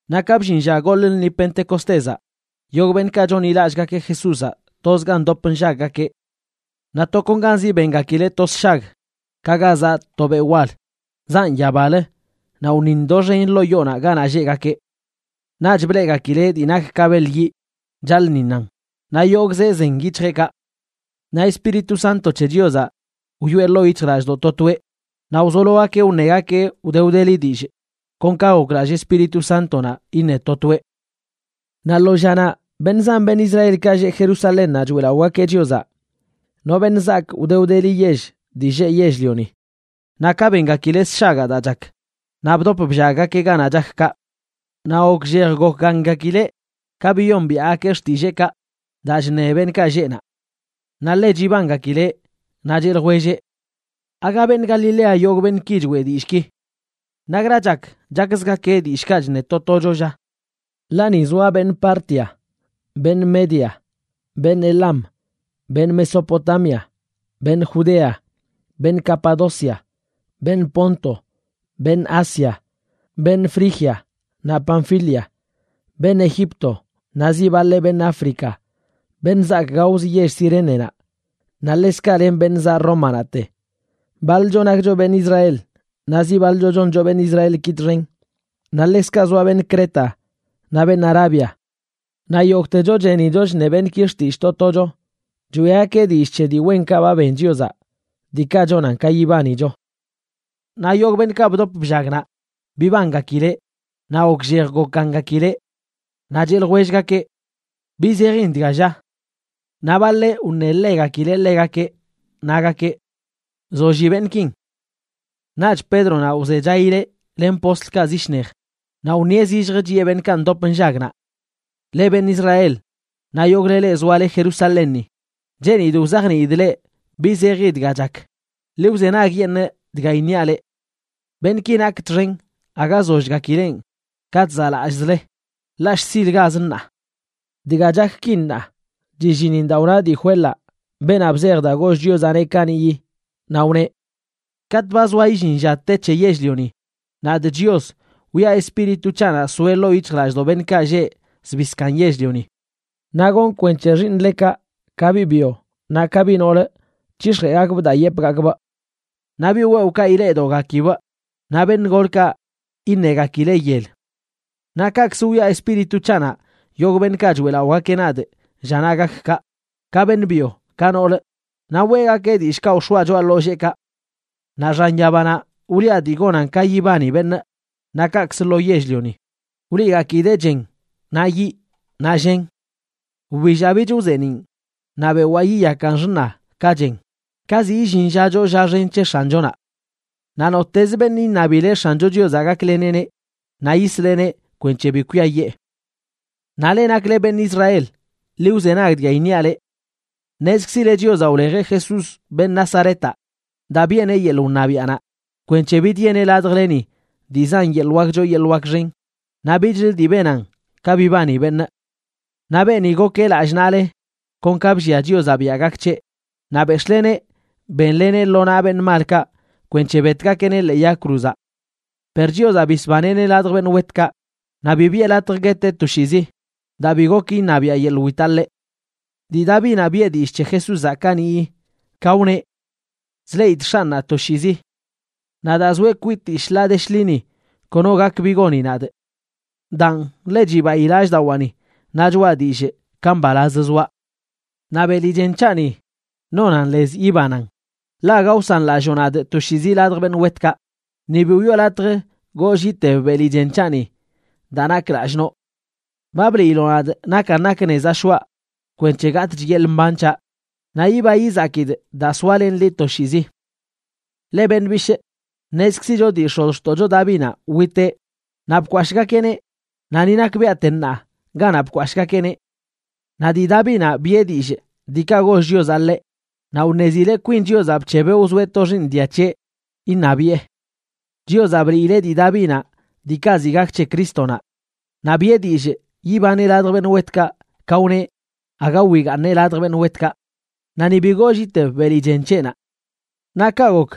Naꞌ ka bllin lla goḻꞌ lṉi Pentecostézaꞌ, yogꞌ beṉꞌkaꞌ chonḻilallꞌgakeꞌ Jesúzaꞌ tozga ndop nllaggakeꞌ. Naꞌ tokonganzi bengakileꞌ to sshag ka ga zaꞌ to beꞌ wal, zaꞌn yabalə naꞌ wṉiṉ doxen ḻoo yoonaꞌ ganaꞌ lleꞌgakeꞌ. Naꞌch bleꞌgakileꞌ dii nak ka beḻ yiꞌ chaḻꞌṉiṉan, naꞌ yogꞌzeꞌ zen yic̱hjeꞌkaꞌ. Naꞌ Espíritu Santo c̱he Chiozaꞌ wyoꞌe ḻoo yic̱hjlallꞌdoꞌ to toeꞌ, naꞌ wzologakeꞌ wṉegakeꞌ wde wdeli dillꞌ, kon ka goklallꞌ Espíritu Sántonaꞌ iṉe to toeꞌ. Naꞌ lo llanaꞌ beṉꞌ zan beṉꞌ Israelkaꞌ lleꞌ Jerusalénnaꞌ choeꞌlaꞌogakeꞌ Chiozaꞌ, no beṉꞌ zaak wde wdeli yell dii lleꞌ yell-lioni. Naꞌ ka bengakileꞌ sshagaꞌ daa chak, naꞌ bdop bllaggakeꞌ ganaꞌ chak kaꞌ. Naꞌ gokllej gokgaṉgakileꞌ ka biyombiaꞌgakeꞌ xtilleekaꞌ daa chṉe beṉꞌkaꞌ lleꞌ naꞌ. Naꞌ ḻe chibangakileꞌ, naꞌ cheꞌ ljwelleꞌ: ―¿Aaga beṉꞌ Galilea yogꞌ beṉꞌki choeꞌ dillꞌki? ¿Nakra chak chakzgakeꞌ dillꞌkaꞌ chṉe to tocho, lla? Ḻaꞌ ni zoa beṉꞌ Partia, beṉꞌ Media, beṉꞌ Elam, beṉꞌ Mesopotamia, beṉꞌ Judea, beṉꞌ Capadocia, beṉꞌ Ponto, beṉꞌ Asia, beṉꞌ Frigia naꞌ Panfilia, beṉꞌ Egipto naꞌ zi baḻeꞌ beṉꞌ África, beṉꞌ zaak gaozə yell Cirénenaꞌ, naꞌ ḻekzkaꞌ len beṉꞌ zaꞌ Rómanaꞌte. Baḻcho nakcho beṉꞌ Israel, naꞌ zi baḻcho choncho beṉꞌ Israelki txen. Naꞌ ḻekzkaꞌ zoa beṉꞌ Creta naꞌ beṉꞌ Arabia. Naꞌ yogꞌtecho chenicho chṉe beṉꞌki xtillꞌ to tocho, choeꞌgakeꞌ dillꞌ c̱he dii wenkaꞌ ba ben Chiozaꞌ, diikaꞌ chonan ka yibanicho. Naꞌ yogꞌ beṉꞌkaꞌ bdop bllag naꞌ, bibangakileꞌ naꞌ gokllej gokgaṉgakileꞌ. Naꞌ cheꞌ ljwellgakeꞌ: ―¿Bi zejin dga, lla? Naꞌ baḻeꞌ wṉeḻegakileꞌ ḻegakeꞌ, nagakeꞌ: ―Zolli beṉꞌkin. Naꞌch Pédronaꞌ wzechaileꞌ len postlkaꞌ zi shnej, naꞌ wṉieꞌ zillj chiꞌe beṉꞌkaꞌ ndop nllag naꞌ: ―Leꞌ beṉꞌ Israel naꞌ yogꞌle leꞌ zoale Jerusalénni, cheenidꞌ wzajniidꞌ leꞌ bi zeji dga chak, ḻi wzenagyeṉꞌ dga iṉiaꞌ leꞌ. Beṉꞌki nakꞌ txen aga zollgakilenꞌ ka chzaꞌlallꞌzle, ḻaꞌ shzilgaz ṉaa. Dga chak ki ṉaa, chillinin daa wna dii Joelaꞌ, beenaꞌ bzej daa goll Chiozaꞌneꞌ kaniꞌyi, naꞌ wneꞌ: Katꞌ ba zoa illin lla te c̱he yell-lioni, nadꞌ Chios wiꞌa Espíritu c̱haꞌnaꞌ soeꞌ ḻoo yic̱hjlallꞌdoꞌ beṉꞌkaꞌ lleꞌ zbii zkaaṉ yell-lioni. Naꞌ gonꞌ kwenc̱he xiiṉlekaꞌ, ka biꞌ byo naꞌ ka biꞌ noolə, c̱hix̱jeꞌgakbꞌ daa yepꞌgakbꞌ. Naꞌ biꞌ wewꞌkaꞌ ileꞌdoꞌgakibꞌ, naꞌ beṉꞌ golkaꞌ iṉegakileꞌ yel. Naꞌ kaꞌkzə wiꞌa Espíritu c̱haꞌnaꞌ yogꞌ beṉꞌkaꞌ choeꞌlaꞌogakeꞌ nadꞌ llanaꞌ gak kaꞌ, ka beṉꞌ byo ka noolə, naꞌ weꞌgakeꞌ dillꞌkaꞌ wx̱oaꞌ choꞌa ḻolleekaꞌ. Naꞌ xan yabanaꞌ wliꞌa dii gonan ka yibani beṉꞌ, naꞌ kaꞌkzə lo yell-lioni wliꞌgakidee chen, naꞌ yiꞌ, naꞌ llen. Wbillaꞌ bich wzeeniꞌn, naꞌ bewaa yiyakan xṉa ka chen ka ziꞌ illin lla choo lla xen c̱he X̱anchonaꞌ. Naꞌ nottez beṉꞌ iṉabileꞌ X̱ancho Chiozaꞌ gakleneꞌneꞌ, naꞌ yisleꞌneꞌ kwenc̱he bi kwiayee. ’Naꞌ leꞌ nakle beṉꞌ Israel, ḻi wzenag dga iṉiaꞌ leꞌ. Ṉezkzile Chiozaꞌ wlejeꞌ Jesús, beṉꞌ Nazaretaꞌ, daa biꞌeneꞌ yeḻꞌ wṉabiaꞌnaꞌ kwenc̱he bidyeneꞌ ladjleni dii zan yeḻꞌ wak choo yeḻꞌ wak xen naꞌ bichlə dii benan ka bibani beṉꞌ. Naꞌ beeni gokeꞌ lallꞌ naꞌle kon ka bllia Chiozaꞌ biaꞌ gak c̱heꞌ, naꞌ béx̱ꞌleneꞌ bénleneꞌ lo naꞌ beṉꞌ malkaꞌ kwenc̱he betgakeꞌneꞌ ḻee yag cruzaꞌ. Per Chiozaꞌ bisbaneꞌneꞌ ladj beṉꞌ wetkaꞌ, naꞌ bi biꞌe latj gueteꞌ toshiizi, daa bi gok iṉabiaꞌ yeḻꞌ witaꞌ ḻeꞌ. Dii Davinaꞌ biꞌe dillꞌ c̱he Jesúzaꞌ kaniꞌyi, ka wneꞌ: Chleꞌidꞌ X̱anꞌnaꞌ toshiizi. Naꞌ daa zoeꞌ kwitii shḻaa de shḻini kono gak bi goni nadꞌ. Daan ḻe chibayi lallꞌdawaani naꞌ choꞌa dillꞌ ka mbalaz zoaꞌ. Naꞌ beli chen c̱haꞌni nonan lez yibanan, ḻaꞌ aga wsanlalloo nadꞌ toshiizi ladj beṉꞌ wetkaꞌ, ni bi wiꞌo latj goollꞌ iteb beli chen c̱haꞌni daa nakꞌ lallꞌ noꞌ. Ba bliiloꞌ nadꞌ nakan nak nezaꞌ shoꞌa kwenc̱he gatꞌch yeḻꞌ mban c̱haꞌ, naꞌ yiba yizakidꞌ daa soalenꞌ liꞌ toshiizi. ’Leꞌ beṉꞌ bishꞌ, ṉezkzicho dii x̱ozxtoꞌcho Davinaꞌ witeꞌ naꞌ bkwashꞌgakeꞌneꞌ, naꞌ ni nakbiaꞌte ṉaa ganaꞌ bkwashꞌgakeꞌneꞌ. Naꞌ dii Davinaꞌ biꞌe dillꞌ diikaꞌ goll Chiozaꞌ ḻeꞌ, naꞌ wṉezileꞌ kwin Chiozaꞌ bc̱hebeꞌ wzoeꞌ to xiiṉ diaꞌ c̱heꞌ iṉabiꞌe. Chiozaꞌ bliileꞌ dii Davinaꞌ diikaꞌ ziꞌ gak c̱he Crístonaꞌ, naꞌ biꞌe dillꞌ yibaneꞌ ladj beṉꞌ wetkaꞌ ka wneꞌ aga wigaaṉeꞌ ladj beṉꞌ wetkaꞌ naꞌ ni bi goollꞌ iteb beli chen c̱heꞌnaꞌ. Naꞌ kaꞌ gok,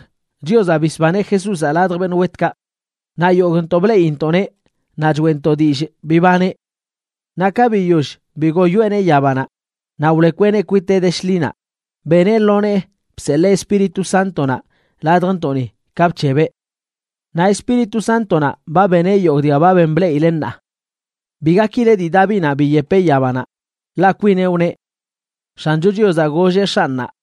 Chiozaꞌ bisbaneꞌ Jesúzaꞌ ladj beṉꞌ wetkaꞌ, naꞌ yogꞌntoꞌ bleꞌintoꞌneꞌ naꞌ choeꞌntoꞌ dillꞌ bibaneꞌ. Naꞌ ka biyoll bigoyoeꞌneꞌ yabanaꞌ naꞌ wlekweꞌneꞌ kwiteꞌ de shḻinaꞌ, beneꞌ lo nee bseḻee Espíritu Sántonaꞌ ladjntoꞌni ka bc̱hebeꞌ. Naꞌ Espíritu Sántonaꞌ ba beneꞌ yogꞌ dga ba ben bleꞌile ṉaa. Bi gakile dii Davinanꞌ biyepeꞌ yabanaꞌ, ḻaꞌ kwineꞌ, wneꞌ: X̱ancho Chiozaꞌ golleꞌ X̱anꞌnaꞌ: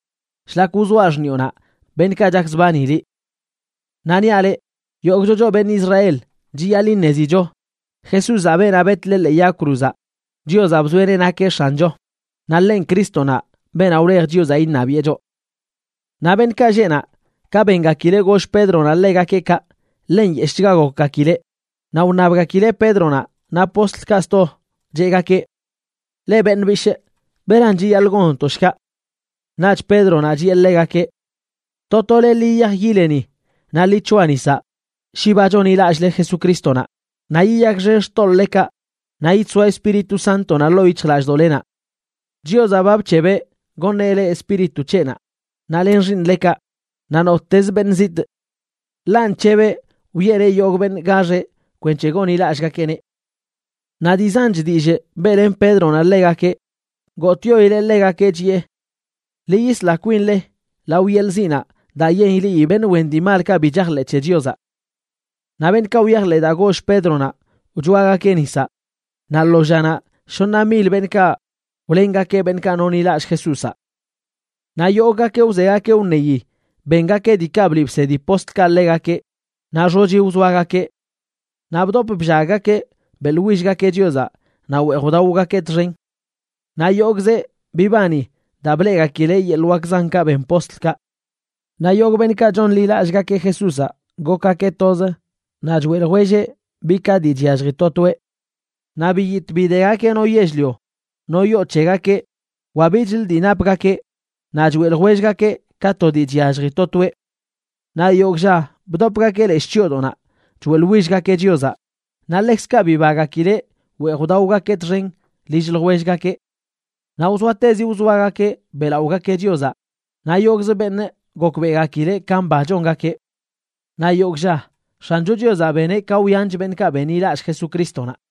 shlak wzoaꞌ xṉiꞌonaꞌ beṉꞌkaꞌ chakzbani liꞌ.” ’Naꞌ niaꞌ leꞌ, yogꞌcho choꞌ beṉꞌ Israel chiyaḻꞌ iṉezicho, Jesúzaꞌ, beenaꞌ betle ḻee yag cruzaꞌ, Chiozaꞌ bzoeꞌneꞌ nakeꞌ X̱ancho, naꞌ ḻenꞌ Crístonaꞌ, beenaꞌ wlej Chiozaꞌ iṉabiꞌe choꞌ. Naꞌ beṉꞌkaꞌ lleꞌ naꞌ ka bengakileꞌ goll Pédronaꞌ ḻegakeꞌ kaꞌ, ḻe nyeshꞌchga gokgakileꞌ, naꞌ wṉabgakileꞌ Pédronaꞌ naꞌ postlkaꞌ sto, cheꞌgakeꞌ: ―Leꞌ beṉꞌ bishꞌ, ¿beran chiyaḻꞌ gonntoꞌ shkaꞌ? Naꞌch Pédronaꞌ chiꞌe ḻegakeꞌ: ―To tole, ḻi yiyaj yileni naꞌ ḻi c̱hoa nisaꞌ shi ba chonḻilallꞌle Jesucrístonaꞌ, naꞌ yiyakxen xtoḻꞌlekaꞌ naꞌ yidsoa Espíritu Sántonaꞌ ḻoo yic̱hjlallꞌdoꞌlenaꞌ. Chiozaꞌ ba bc̱hebeꞌ goṉeꞌ le Espíritu c̱heꞌnaꞌ, naꞌ len xiiṉlekaꞌ, naꞌ nottez beṉꞌ zitꞌ. Ḻaꞌ nc̱hebeꞌ wiꞌeneꞌ yogꞌ beṉꞌ gaxeꞌ kwenc̱he gonḻilallꞌgakeꞌneꞌ. Naꞌ dii zanch dillꞌ beꞌlen Pédronaꞌ ḻegakeꞌ, gotꞌyoileꞌ ḻegakeꞌ, chiꞌe: ―Ḻi yisla kwinle lao yelꞌ ziꞌnaꞌ daa ileꞌi beṉꞌ wen dii malkaꞌ bi chajḻeꞌ c̱he Chiozaꞌ. Naꞌ beṉꞌkaꞌ wyajḻeꞌ daa goll Pédronaꞌ wchoagakeꞌ nisaꞌ; naꞌ lo llanaꞌ shoṉa mil beṉꞌkaꞌ wlengakeꞌ beṉꞌkaꞌ nonḻilallꞌ Jesúzaꞌ. Naꞌ yogꞌgakeꞌ wzegakeꞌ wṉeyi bengakeꞌ diikaꞌ bliꞌ bsedi postlkaꞌ ḻegakeꞌ, naꞌ xochi wzoagakeꞌ. Naꞌ bdop bllaggakeꞌ beꞌḻwillgakeꞌ Chiozaꞌ naꞌ weej wdaogakeꞌ txen. Naꞌ yogꞌzeꞌ bibani daa bleꞌgakileꞌ yeḻꞌ wak zankaꞌ ben postlkaꞌ. Naꞌ yogꞌ beṉꞌkaꞌ chonḻilallꞌgakeꞌ Jesúzaꞌ gokgakeꞌ toz, naꞌ choeꞌ ljwelleꞌ bi ka dii chyallji to toeꞌ. Naꞌ biyitꞌ bidegakeꞌ no yell-lio, no yoo c̱hegakeꞌ wa bichlə dii napgakeꞌ naꞌ choeꞌ ljwellgakeꞌ ka to dii chyallji to toeꞌ. Naꞌ yogꞌ lla bdopgakeꞌ leshꞌ chyoodoꞌnaꞌ choeꞌḻwillgakeꞌ Chiozaꞌ, naꞌ ḻekzkaꞌ bibagakileꞌ weej wdaogakeꞌ txen lill ljwellgakeꞌ. Naꞌ wzoatezi wzoagakeꞌ beꞌlaꞌogakeꞌ Chiozaꞌ naꞌ yogꞌzə beṉꞌ gokbeꞌgakileꞌ ka mba chongakeꞌ. Naꞌ yogꞌ lla, X̱ancho Chiozaꞌ beneꞌ ka wyanch beṉꞌkaꞌ benḻilallꞌ Jesucrístonaꞌ.